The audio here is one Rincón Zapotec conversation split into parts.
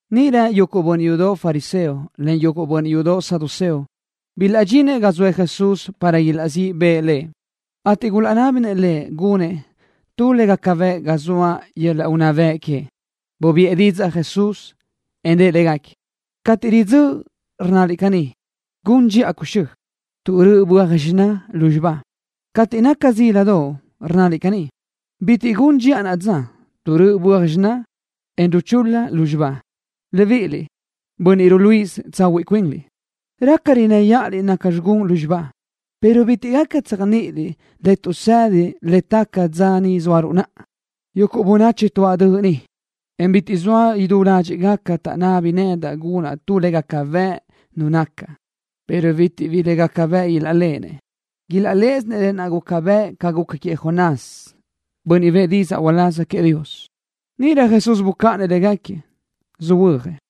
Níʼirö yuguʼ bönniʼ yudoʼ fariseo len yuguʼ bönniʼ yudoʼ saduceo bilaʼdxinëʼ ga zoëʼ Jesús para ilaʼzíʼ bëʼë Lëʼ, ateʼ gulaʼnábinëʼ Lëʼ gunëʼ tu le gaca bëʼ ga zaʼ yöl-laʼ unná bëʼ queëʼ. Bubiʼë didzaʼ Jesús, en rëʼ légaquiëʼ: —Cateʼ ridzö́ʼ, rnnaliʼ caní: “Gun dxiʼa cuxö́, tuʼ röʼö böaj xiná lúzxiba.” Cateʼ naca zíladoʼ, rnnaliʼ caní: “Bitiʼ gun dxiʼa naʼa dza tuʼ röʼö böaj xiná, en ruchul-la lúzxiba.” Libíʼiliʼ, bönniʼ ruluíʼisö tsahuiʼ cuinliʼ. Raca innë́ yaʼaliʼ naca gun lúzxiba, pero bitiʼ gaca tséajniʼiliʼ le tuʼsedi le taca dza ni zóaruʼ naʼa. Yuguʼ bönachi tuáʼ döʼ ni, en bitiʼ zoa idú ládxiʼgaca taʼnábini nedaʼ gunaʼ tu le gaca bëʼ Nu nacaʼ, pero bitiʼ bi le gaca bëʼ ilaʼléʼenëʼ. Ilaʼléʼesinëʼ lë naʼ guca bëʼ ca guca queëʼ Jonás, bönniʼ bëʼë didzaʼ uláz queëʼ Dios. Níʼirö Jesús bucáʼanëʼ légaquiëʼ, söhuö́jëʼ.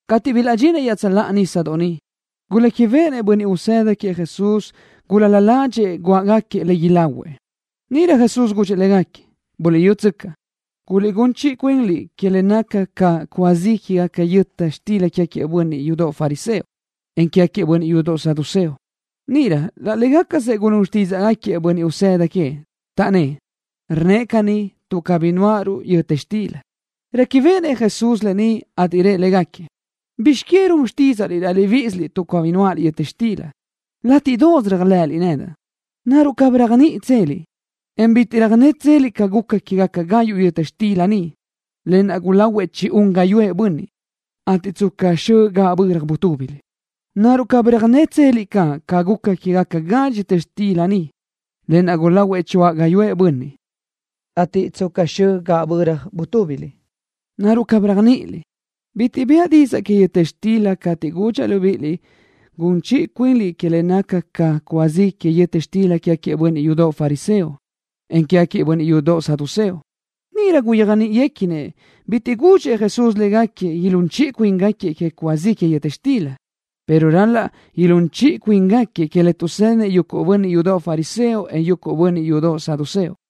Cateʼ bilaʼdxinëʼ iaʼtsöláʼa nísadoʼ niʼ, guléquibeʼenëʼ bönniʼ usëda queëʼ Jesús gulál-la ládxiʼgaquiëʼ iluʼë le ilahuëʼ. Níʼirö Jesús gudxëʼ légaquiëʼ: —Buliʼyútsöcaʼ. Guliʼgún chiʼi cuinliʼ que le naca ca cúa zi que yöta xtila quégaquiëʼ bönniʼ yudoʼ fariseo, en quégaquiëʼ bönniʼ yudoʼ saduceo. Níʼirö laʼ légacasëʼ gulún xtídzaʼgaquiëʼ bönniʼ usëda queëʼ, taʼnnë́ʼ: —Rnnëʼ caní tuʼ cabí nuáʼaruʼ yöta xtila. Réquibeʼenëʼ Jesús lë ni, ateʼ rëʼ légaquiëʼ: —¿Bizx que run xtídzaʼliʼ laʼ libíʼisiliʼ tuʼ cabí nuáʼaliʼ yöta xtila? Látiʼdoʼos réajlëʼëliʼ nedaʼ. ¿Naruʼ cabí réajniʼitseliʼ, en bitiʼ röjnétseliʼ ca guca quégaca gayuʼ yöta xtila niʼ, lë naʼ gulahuëʼ chi-un gáyuʼë bönniʼ, ateʼ tsca xö gaʼböra butúbiliʼ? ¿Naruʼ cabí röjnétseliʼ caʼ ca guca quégaca gadxi yöta xtila niʼ, lë naʼ gulahuëʼ choáʼ gáyuʼë bönniʼ, ateʼ tsca xö gaʼböra butúbiliʼ? ¿Naruʼ cabí réajniʼiliʼ? Bitiʼ bëʼa didzaʼ que yöta xtila cateʼ gudxaʼ libíʼiliʼ gun chiʼi cuinliʼ que le naca ca cúa zi que yöta xtila quégaquiëʼ bönniʼ yudoʼ fariseo, en quégaquiëʼ bönniʼ yudoʼ saduceo. Níʼirö gulaʼyéajniʼinëʼ bitiʼ gudxëʼ Jesús légaquiëʼ ilún chiʼi cuíngaquiëʼ que cúa zi que yöta xtila, pero ral-laʼ ilún chiʼi cuíngaquiëʼ que le tuʼsédinëʼ yuguʼ bönniʼ yudoʼ fariseo, en yuguʼ bönniʼ yudoʼ saduceo.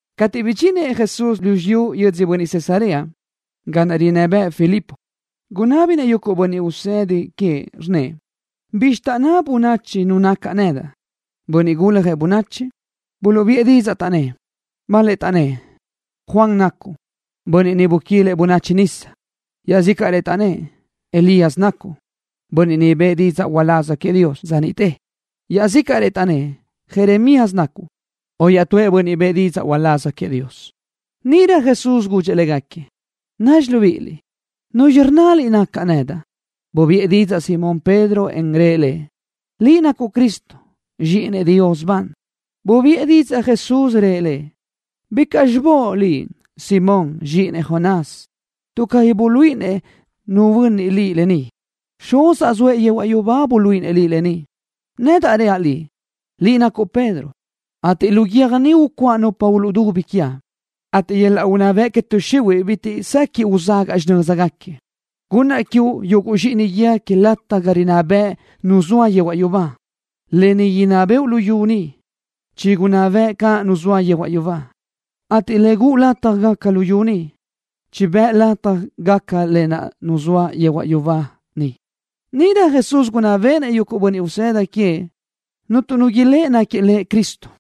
Cateʼ bidxinëʼ Jesús lu xiyú yödzö Cesarea, ga naʼ rinná bëʼë Filipo, gunábinëʼ yuguʼ bönniʼ usëda queëʼ, rnnëʼ: —¿Bizxi taʼnná bönachi nu nacaʼ nedaʼ, Bönniʼ Guljëʼ Bönachi? Buluʼbiʼë didzaʼ, taʼnnë́ʼ: —Bal-lëʼ taʼnnë́ʼ: “Juan nacuʼ, bönniʼ niʼ buquilëʼ bönachi nisa.” Iaʼzícaʼrëʼ taʼnnë́ʼ: “Elías nacuʼ, bönniʼ niʼ bëʼë didzaʼ uláz queëʼ Dios dza niʼte.” Iaʼzícaʼrëʼ taʼnnë́ʼ: “Jeremías nacuʼ, o iaʼtúëʼ bönniʼ bëʼë didzaʼ uláz queëʼ Dios.” Níʼirö Jesús gudxëʼ légaquiëʼ: —Naruʼ libíʼiliʼ, ¿nuzxi rnnaliʼ nacaʼ nedaʼ? Bubiʼë didzaʼ Simón Pedro, en rëʼ Lëʼ: —Liʼ nacuʼ Cristo, Zxíʼinëʼ Dios ban. Bubiʼë didzaʼ Jesús, rëʼ lëʼ: —Bicaʼ xibóʼ liʼ, Simón, zxíʼinëʼ Jonás, tuʼ cabí buluíʼinëʼ nu bönniʼ liʼ lë ni. Xuzaʼ zoëʼ yehuaʼ yubá buluíʼinëʼ liʼ lë ni. Nedaʼ reaʼ liʼ, liʼ nacuʼ Pedro, ateʼ lu guiö́j ni ucuáʼa nupa uluʼdubi quiaʼ, ateʼ yöl-laʼ unná bëʼ que tuʼ xihuiʼ bitiʼ sequiʼ uzagaʼ xinö́zgaquiëʼ. Gunnaʼ quiuʼ yuguʼ zxíʼini guíë que lataj ga rinná bëʼ Nu zoa yehuaʼ yubá. Le inná bëʼu luyú ni, chigunná bëʼ caʼ Nu naʼ zoa yehuaʼ yubá, ateʼ le guʼu lataj gaca luyú ni, chibë́ʼ lataj gaca lë naʼ Nu naʼ zoa yehuaʼ yubá niʼ. Níʼirö Jesús gunná béʼenëʼ yuguʼ bönniʼ usëda queëʼ cuntu nu ilë́ʼë náquiëʼ Lëʼ Cristo.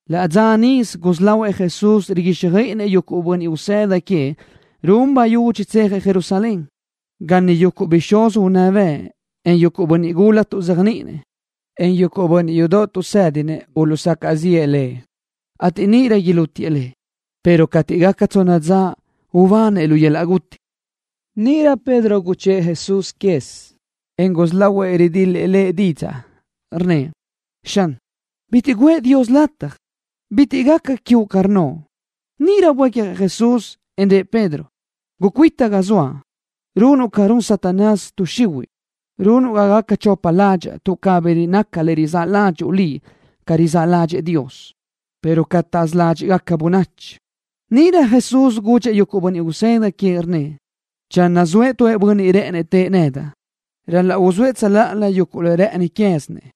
Laʼ dza níʼisö gusí lahuëʼ Jesús riguíxjöiʼinëʼ yuguʼ bönniʼ usëda queëʼ run bayudxi tsejëʼ Jerusalén, ga niʼ yuguʼ bixúz unná bëʼ en bönniʼ gula tuʼzéajniʼinëʼ, en bönniʼ yudoʼ tuʼsédinëʼ uluʼsacaʼ ziʼë Lëʼ, ateʼ níʼirö ilútiëʼ Lëʼ, pero cateʼ gaca tsonna dza ubanëʼ lu yöl-laʼ guti. Níʼirö Pedro guchë́ʼë Jesús quez, en gusí lahuëʼ ridil-lëʼ Lëʼ didzaʼ, rnnëʼ: —Xan, bitiʼ guʼë Dios lataj. Bitiʼ caʼ gaca quiuʼ ca rnnoʼ. Níʼirö buécjëʼ Jesús, en rëʼ Pedro: —Gucuita ga zoaʼ. Runuʼ ca run Satanás, tuʼ xihuiʼ. Runuʼ ga gaca chopa ládxaʼa tuʼ cabí naca le rizáʼ ládxuʼu liʼ ca rizáʼ ládxëʼë Dios, pero ca taʼzaʼsö ládxiʼgaca bönachi. Níʼirö Jesús gudxëʼ yuguʼ bönniʼ usëda queëʼ, rnnëʼ: —Channö zoëʼ tu bönniʼ rë́ʼënëʼ tëʼë nedaʼ, ral-laʼ uzóëʼ tsöláʼalö yuguʼ le rë́ʼëni quézinëʼ,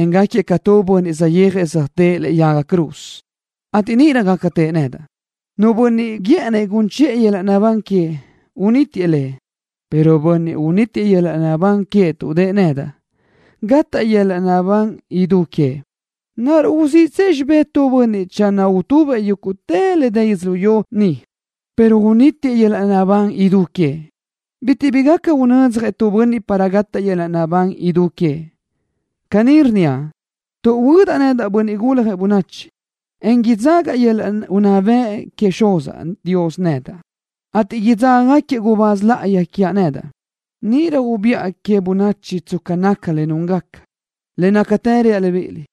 en gáquiëʼ ca tu bönniʼ saʼyéajëʼ zeajtë́ʼë lëʼe yaga cruz, ateʼ níʼirö gaca tëʼë nedaʼ. Nu bönniʼ guë́ʼënnëʼ gun chiʼë yöl-laʼ naʼbán queëʼ, unítiëʼ le, pero bönniʼ unítiëʼ yöl-laʼ naʼbán queëʼ tuʼ dëʼë nedaʼ, gataʼ yöl-laʼ naʼbán idú queëʼ. ¿Naruʼ uziʼtsëʼ xibé tu bönniʼ channö utubëʼ yúguʼtë le dë yödzölió ni pero unítiëʼ yöl-laʼ naʼbán idú queëʼ? Bitiʼ bi gaca unödzjëʼ tu bönniʼ para gataʼ yöl-laʼ naʼbán idú queëʼ. Caní rnníaʼ, tuʼ huödaʼ nedaʼ, Bönniʼ Guljëʼ Bönachi, en idzaga yöl-laʼ unná bëʼ queëʼ Xuzaʼ Dios nedaʼ, ateʼ idzágagaquiëʼ gubáz láʼayi quiaʼ nedaʼ. Níʼirö ubiʼa que queë bönachi tsca naca le núngaca. Le nácatë reaʼ libíʼiliʼ: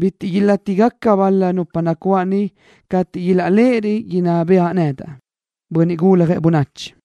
“Bitiʼ caʼ ilátigaca bal-la nupa nacuáʼ ni cateʼ ilaʼléʼerö idinná bëʼa nedaʼ, Bönniʼ Guljëʼ Bönachi.”